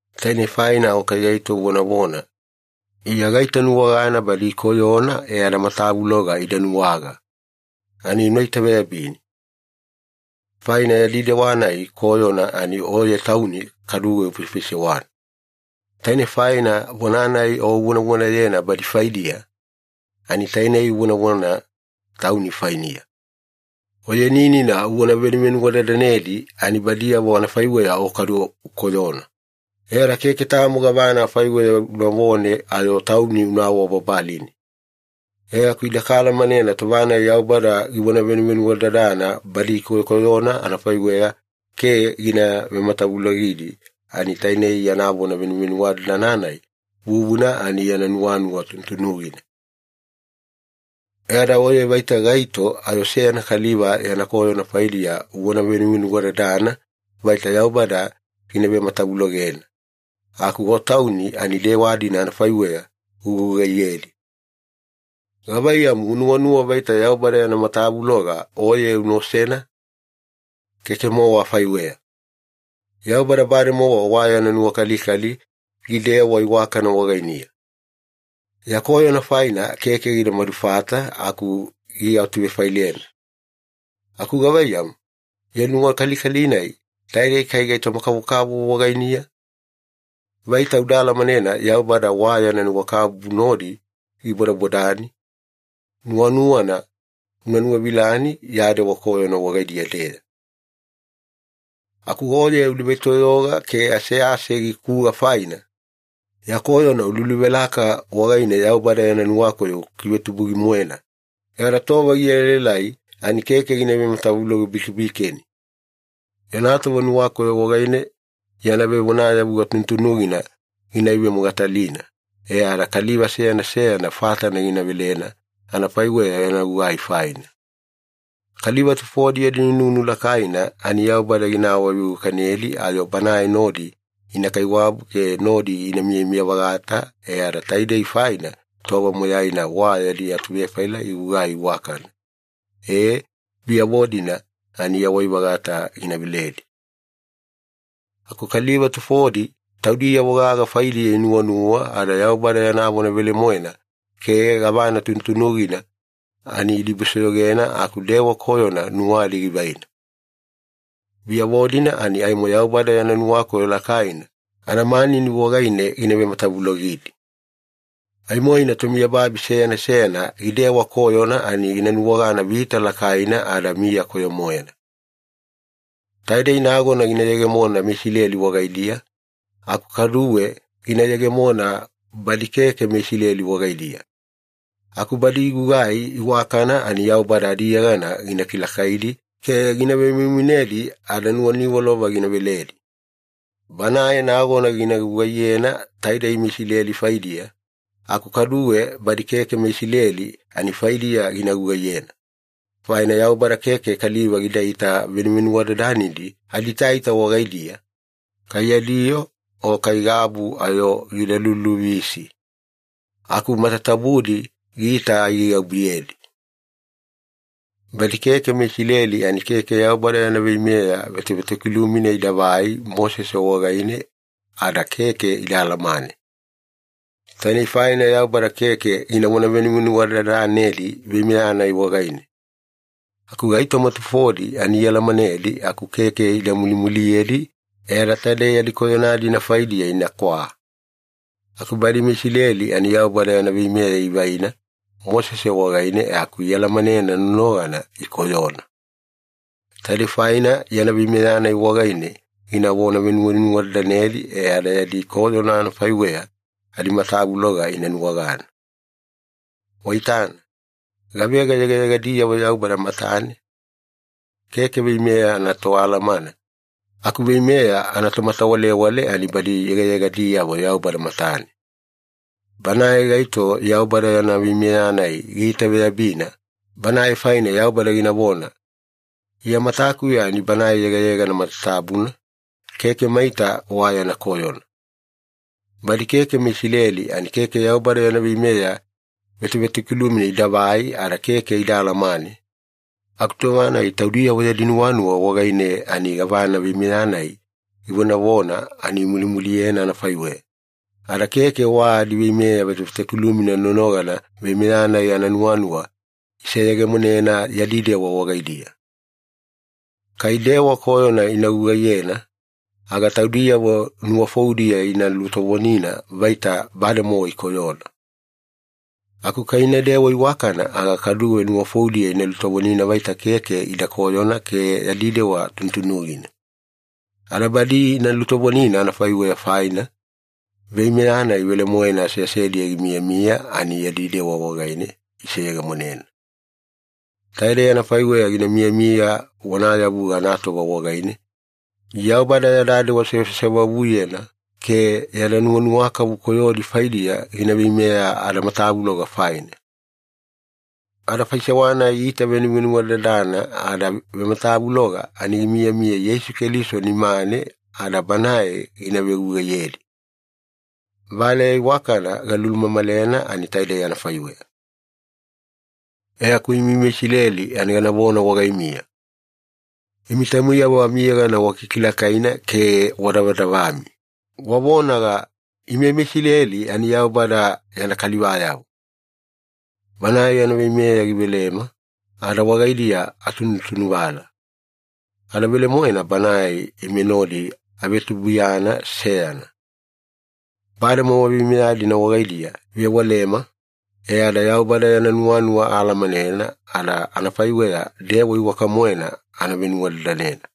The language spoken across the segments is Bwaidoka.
Tainei faina o kai gaito uvonavona, “Iya gaitanuwagana badi ikoyona e ada matavuloga ida nuwaga,” ani una itaveyabini. Faina yadi dewa-nai koyona ani oye tauni kaduwe ufaifaisewana. Taine faina vona-nai o uvonavonayena badi faidiya, ani taine uvonavona tauni fainiya. Oyeni-nina uvona venuwadadanedi ani badiyavo anafaiweya o kadu ukoyona, e ada keke tamo gavana afaiweya unavone ayo tauni una awabababalini. E aku ide kaalamanena tova-nai Yaubada givona venuvenuwadadana badi ikoyokoyona anafaiweya ke gina vematavulogidi ani tainei yana vona venuwadadana-nai vuvuna ani yana nuwanuwa tunutunugina. E ada oye vaita gaito ayo seyana kaliva yana koyona faidiya uvona venuvenuwadadana vaita Yaubada gina vematavulogena, aku o tauni ani dewa-dina anafaiweya ugugugaiyedi. Gavaiyamu, unuwanuwa vaita Yaubada yana matavuloga oye una osena? Keke-mowa afaiweya. Yaubada bademowa wa yana nuwakalikali gidewa iwakana wagainiya. Ya koyona faina keke gida madulufata aku giatuvefailena. Aku gavaiyamu, yana nuwakalikali-nai taidei kai gaitoma-kavokavovo wagainiya? Vaita uda alamanena Yaubada wa yana nuwakabubu nodi gibodabodani, nuwanuwana una nuwavilani ya dewa koyona wagaidiya-deya. Aku oye udebaitoyoga ke asease gikuga faina, ya koyona ululuvelaka wagaine Yaubada yana nuwakoyo ukikivetubugi-moena, e ada tova gielaelai ani keke gina vematavuloge-bikebikeni. Yana tova nuwakoyo wagaine yana vevonayavuga tunutunugina gina ivemogatalina e ada kaliva seyana seyana fatana gina velena anafaiweya yana gugai faina. Kaliva tufodi yadi nunu lakaina ani Yaubada gina awaveiwakanedi ayo Banae nodi ina kaiwabu ke nodi ina miyamiya-vagata e ada taidei faina tova moyaina wa yadi atuvefaila igugai iwakana, e, biyavo-dina ani yawai-vagata gina veledi. Aku kaliva tufodi taudiyavo gaga faidiya inuwanuwa, ada Yaubada yana vona velemoena ke gavana tunutunugina ani idibusoyogena aku dewa koyona nuwadi givaina. Biyavo-dina ani aimo Yaubada yana nuwakoyo lakaina anamanini wagaine gina vematavulogidi. Aimoina tomiyababi seyana seyana gidewa koyona ani gina nuwagana vita lakaina ada miya koyo-moena. Taidei nagona gina yegemona meIsileli wagaidiya, aku kaduwe gina yegemona badi keke meIsileli wagaidiya. Aku badi igugugai iwakana ani Yaubada adiyegana gina kilakaidi ke gina vemoimoinedi ada nuwaniwalova gina veledi. Banae nagona gina gugaiyena taidei meIsileli faidiya, aku kaduwe badi keke meIsileli ani faidiya gina gugaiyena. Faina Yaubada keke kaliva gidaita venuvenuwadadanedi adiitaita wagaidiya, kai yadi yoo o kai gabu ayo gida luluvisi, aku matatabudi giita aigaigabuyedi. Badi keke meIsileli ani keke Yaubada yana veimeya vetovetokilumina idavai Mosese wagaine ada keke ida alamane. Tainei faina Yaubada keke ginavona venuwadadanedi veimeya-nai wagaine. Aku gaitoma tufodi ani ialamanedi aku keke ida mulimuliyedi, e ada taide yadi koyona-dina faidiya inakwa. Aku badi meIsileli ani Yaubada yana veimeya ivaina Mosese wagaine e aku ialamanena nonogana ikoyona. Taidei faina yana veimeya-nai wagaine ginavona venuwadadanedi e ada yadi koyona anafaiweya adimatavuloga ina nuwagana. Waitana, gavega yegayegadiyavo Yaubada matane? Keke veimeya anatoalamana, aku veimeya anatomatawalewale ani badi yegayegadiyavo Yaubada matane. Banae gaito Yaubada yana veimeya-nai giitaveyabina, banae faine Yaubada ginavona, “Iya matakuya ani banae yegayegana matatabuna, keke maita wa yana koyona.” Badi keke meIsileli ani keke Yaubada yana veimeya vetovetokiluma idavai ada keke ida alamane, aku tova-nai taudiyavo yadi nuwanuwa wagaine ani gavana veimeya-nai givonavona ani imulimuliyena anafaiweya, ada keke wa adiveimeya vetovetokilumina nonogana veimeya-nai ananuwanuwa iseyegemonena yadi dewa wagaidiya. Kai dewa koyona ina gugaiyena, aga taudiyavo nuwafoudiya ina lutovonina vaita bademowa ikoyona. Aku kai inadewa iwakana aga kaduwe nuwafoudiya ina lutovonina vaita keke ida koyona ke yadi dewa tunutunugina. Ada badi ina lutovonina anafaiweya faina, veimeya-nai velemoena aseasediya gimiyamiya ani yadi dewa wagaine iseyegemonena. Taidei anafaiweya gina miyamiya vonayavuga anatova wagaine, Yaubada yada dewa sewasewavuyena ke yada nuwanuwakavu koyodi faidiya gina veimeya adamatavuloga faina. Ada faisewa-nai itavenuvenuwadadana ada vematavuloga ani gimiyamiya Yeisu Keliso nimane ada Banae gina vegugaiyedi. Valeya iwakana galulumamalena ani taidei anafaiweya. E aku imi meIsileli ani ganavona wagaimiya. Imi taumiyavo amiyegana wakikilakaina ke wadavadavami, wavonaga, “Ime meIsileli ani Yaubada yana kalivayavo. Banae yana veimeya givelema, ada wagaidiya atunutunuvala. Ada velemoena Banae ime nodi avetubuiyana seyana. Bademowa veimeya-dina wagaidiya ivewalema, e ada Yaubada yana nuwanuwa aalamanena ada amafaiweya dewa iwaka-moena ana venuwadadanena.”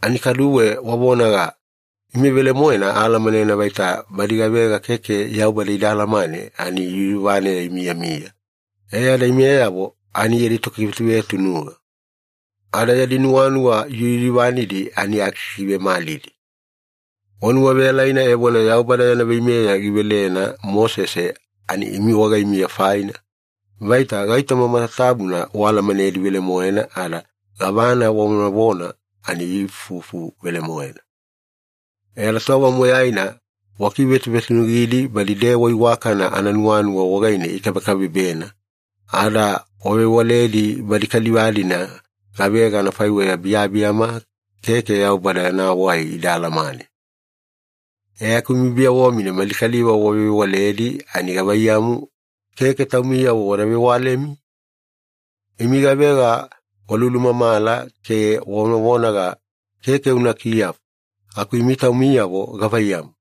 Ani kaduwe wavonaga, “Ime velemoena aalamanena vaita badi gavega keke Yaubada ida alamane ani yuyuvaneya imiyamiya, e ada imeyavo ani yadi tokivetuvetunuga. Ada yadi nuwanuwa yuyuvanidi ani akikivemalidi.” Wanuwaveyalaina evona Yaubada yana veimeya givelena Mosese ani imi wagaimiya faina, vaita gaitoma matatabuna waalamanedi velemoena ada gavana wavonavona ani ifufu velemoena. E ada tova moyaina wakivetuvetunugidi badi dewa iwakana ananuwanuwa wagaine ikabekabebena, ada wavewaledi badi kaliva-dina gavega anafaiweya biyabiyama keke Yaubada yana wai ida alamane. E aku imi biyavo-mina mali kaliva wavevewaledi ani gavaiyamu, keke taumiyavo wada vewalemi? Imi gavega walulumamala ke wavonavonaga, “Keke una kiyafu!” aku imi taumiyavo gavaiyamu,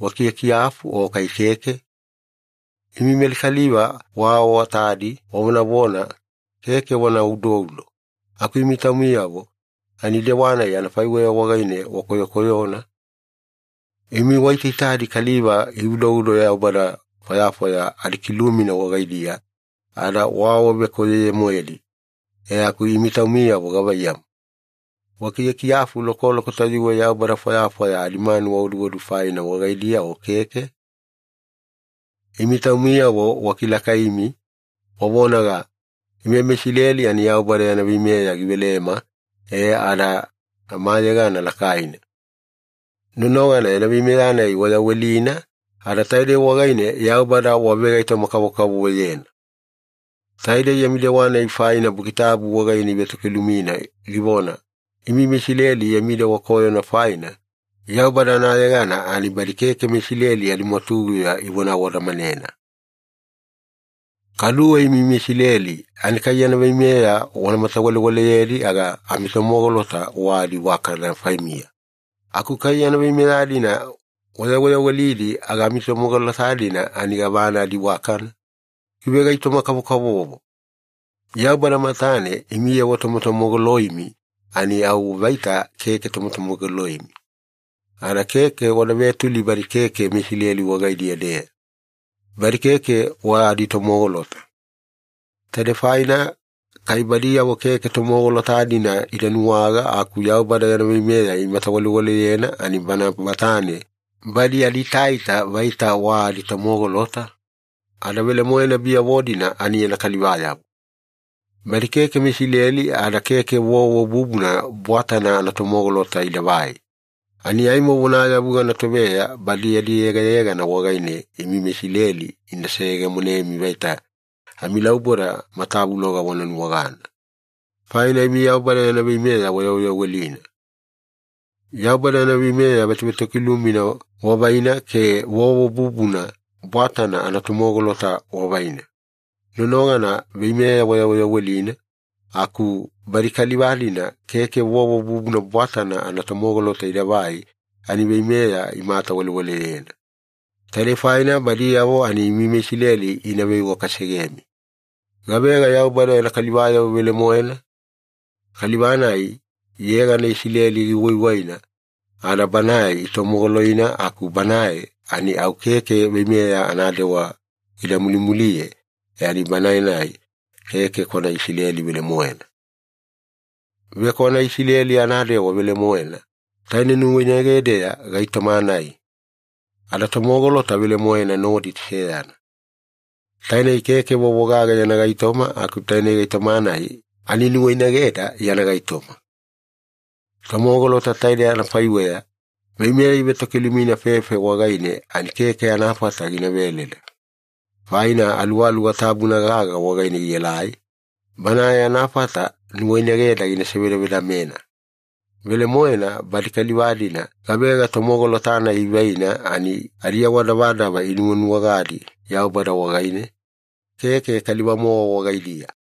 wakiyakiyafu o kai keke? Imi mali kaliva waawatadi wavonavona, “Keke wana udoudo,” aku imi taumiyavo ani dewa-nai anafaiweya wagaine wakoyokoyona! Imi waitaitadi kaliva ioduodu yaubada fwayafwaya adikilumina wagaidiya ada waawavekoyoye-moedi, e aku imi taumiyavo gavaiyamu, wakiyakiyafu lokoloko tayuwe yaubada fwayafwaya adimanuwa oduodu faina wagaidiya o keke? Imi taumiyavo wakilakaimi, wavonaga, “Ime meIsileli ani Yaubada yana veimeya givelema e ada amayegana lakaina,” nonogana yana veimeya-nai wayawelina, ada taidei wagaine Yaubada wavegaitoma-kavokavovoyena. Taidei yami dewa-nai faina Buki Tabu wagaine ivetokilumina givona, “Imi meIsileli yami dewa koyona faina, Yaubada anayegana ani badi keke meIsileli adimwatuguya ivona awadamanena.” Kaduwe imi meIsileli ani kai yana veimeya wana matawalewaleyedi aga amitomogolota wa adiiwakana faimiya. Aku kai yana veimeya-dina wayaweyawelidi aga amitomogolota-dina ani gavana adiiwakana? Givegaitoma-kavokavovo. Yaubada matane imiyavo tomotomogoloimi ani au vaita keke tomotomogoloimi, ada keke wada vetuli badi keke meIsileli wagaidiya-deya, badi keke wa aditomogolota. Taidei faina kai badiyavo keke tomogolota-dina ida nuwaga aku Yaubada yana veimeya imatawalewaleyena ani Bana matane badi adiitaita vaita wa aditomogolota, ada velemoena biyavo-dina ani yana kalivayavo. Badi keke meIsileli ada keke vovo bubuna bwatana anatomogolota idavai, ani aimo vonayavuga anatoveya badi yadi yegayegana wagaine imi meIsileli ina seyegemonemi vaita amilauboda matavuloga wana nuwagana, faina imi Yaubada yana veimeya wayaweyawelina. Yaubada yana veimeya vetovetokilumina wavaina ke vovo bubuna bwatana anatomogolota wavaina, nonogana veimeya wayaweyawelina, aku badi kaliva-dina keke vovo bubuna bwatana anatomogolota idavai ani veimeya imatawalewaleyena. Taidei faina badiyavo ani imi meIsileli ina veiwakasegemi. Gavega Yaubada yana kalivayavo velemoena? Kaliva-nai yegana Isileli giwaiwaina ada banae itomogoloina aku banae ani au keke veimeya anadewa gida mulimuliye e ani banae-nai keke kwana Isileli velemoena. Vekwana Isileli anadewa velemoena, taine nuwainagedeya gaitoma-nai. Ada tomogolota velemoena nodi seyana. Tainei keke vovo gagana yana gaitoma aku taine gaitoma-nai ani nuwainageda yana gaitoma. Tomogolota taide anafaiweya, veimeya ivetokilumina fefe wagaine ani keke anafata gina veleda, faina Aluwaluwa Tabuna gaga wagaine gielai, Banae anafata nuwainageda gina sevedavedamena. Velemoena, badi kaliva-dina gavega tomogolota-nai ivaina ani adiawadavadava inuwanuwagadi Yaubada wagaine, keke kaliva-mowa wagaidiya.